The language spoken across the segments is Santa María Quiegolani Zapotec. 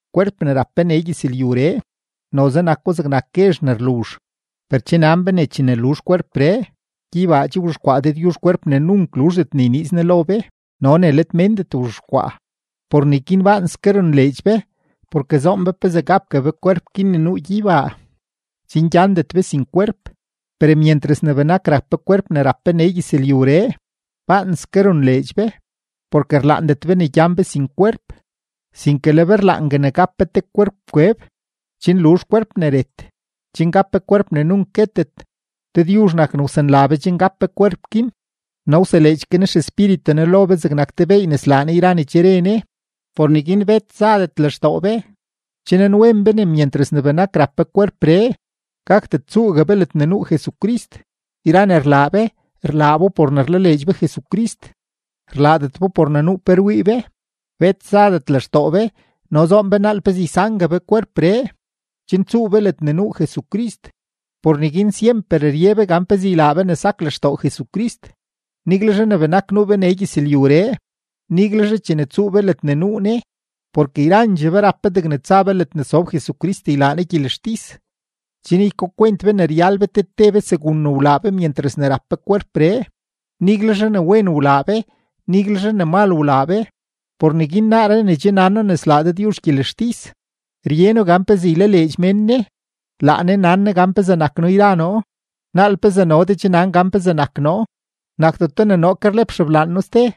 Kwerp ne rap be nee gyëzlyuree, noze nako zegnak guezh ne rluzh, per che nan be ne chene luzh kwerpree, gyeybaa che wzhexkwaa Dëdyuzh kwerp ne nunk luzhdet ne yniiz Ne lo be no ne let méndet wzhexkwaa. Por neguin baanske ronleedx be, porke zoon be pezee gapgue be kwerp guin ne nuu gyeybaa, chen gyandet be sin kwerp. Per myentras ne benak rap be kwerp ne rap be nee gyëzlyuree, baanske ronleedx be, porke rlaandet be ne gyan be sin kwerp, sinke le be rlaangue ne gap be te kwerp kweb, chen luzh kwerp ne ret, chen gap be kwerp ne nunk guetet. Dëdyuzh nak ne wsanla be chen gap be kwerp guin no wseleedx ke Ne XEspíritu Ne lo be zegnak te beey ne slaa Ne yra ne che re Ne. Por neguin bet zadet lextoo be. Che nanwen be ne myentras ne benak rap be kwerpree, gakdet tsuugue be ledne nuu Jesucrist. Yra ne rlaa be, rlaa bo por ne rlaleedx be Jesucrist; rlaadet bo por ne nuu pe rwii be. Bet zadet lextoo be, no zoon be naal pezee ysangue be kwerpree, chen tsuu be ledne nuu Jesucrist. Por neguin syemper rye be gan pezee ylaa be ne sak lextoo Jesucrist, niguelzhe ne benak nuu be nee gyëzlyuree, niguelzhe chene tsuu be ledne nuu Ne. Porke yrandxee be rap be degne tsa be ledne sob Jesucrist ylaa Ne gyelextis, chen ykakwent be ne ryal be te te be segun ne wlaa be myentras ne rap be kwerpree, niguelzhe ne wen wlaa be, niguelzhe ne mal wlaa be. Por neguin naaree ne che nan noo ne slaa Dëdyuzh gyelextis, rye noo gan pezee ylaleedx mén Ne. Laa Ne nan Ne gan pezee nak noo yra noo; naal pezee no de che nan gan pezee nak noo. Nakdeto ne noo ke rlep xeblaan noo ste,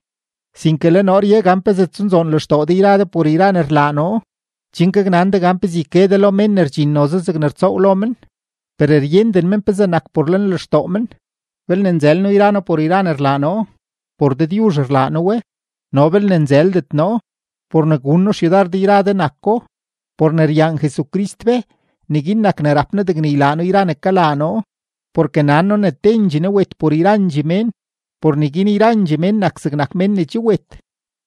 sinke le noo rye gan pezee tsunzoon lextoo de yra de por yra ne rlaa noo, chen gaknan de gan pe yke de lo mén ne rdxin noze zegne rtsoow lo men, per ryenden men pezee nak por lenlextoo men. Belne nzël noo yra noo por yra ne rlaa noo, por Dëdyuzh rlaa noo we; no belne nzëldet noo, por ne gun noo xyudar de yra de nako. Por ne ryaan Jesucrist be, neguin nak ne rap noo degne ylaa noo yra ne kalaa noo, porke nan noo ne tendxee Ne wet por yrandxee mén, por neguin yrandxee mén nak zegnak mén ne che wet.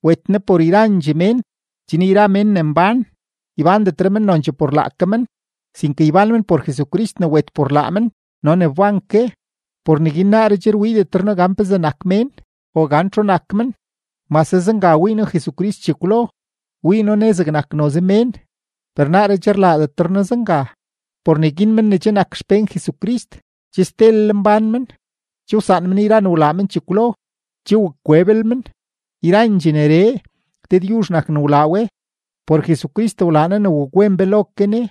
Wet Ne por yrandxee mén, chen yra mén ne mbán, ybándetre men nonchee por laake men, sinke ybán men por Jesucrist ne wet por laa men no ne wban ke. Por neguin naaree che rwiidetre noo gan pezee nak mén o gan txu nak men; mase zenga wii noo Jesucrist chekwlo, wii noo Ne zegnak noze mén, per naaree che rlaadetre noo zenga. Por neguin men ne che nak xpén Jesucrist, che stelel mbán men; che wsaan men yra ne wlaa men chekwlo, che wak kweblel men. Yrandxee neree, Dëdyuzh nak ne wlaa we; por Jesucrist wlaa Ne ne wakwen be lo ke Ne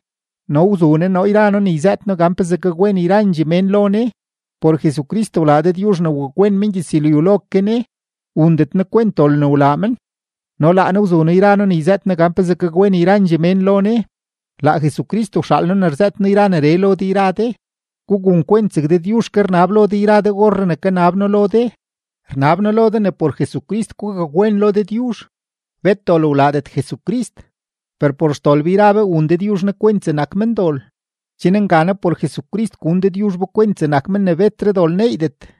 no wzu Ne noo yra noo ne yzëët noo gan pezee gakwen yrandxee mén lo Ne. Por Jesucrist wlaa Dëdyuzh ne wakwen mengyëzlyu lo ke Ne, wundet Ne kwent dol ne wlaa men; no laa Ne wzu noo yra noo ne yzëët noo gan pezee gakwen yrandxee mén lo Ne. Laa Jesucrist wxaal noo ne rzëët noo yra neree lo de yra de; gugun kwent zeg Dëdyuzh ke rnab lo de orree ne kanab noo lo de, rnab noo lo de ne por Jesucrist gugakwen lo Dëdyuzh. Bet dol wlaadet Jesucrist, per por xdol be yra be wun Dëdyuzh Ne kwent zegnak mendol, chen nganaa por Jesucrist gun Dëdyuzh be kwent zegnak men ne betre dol neeydet.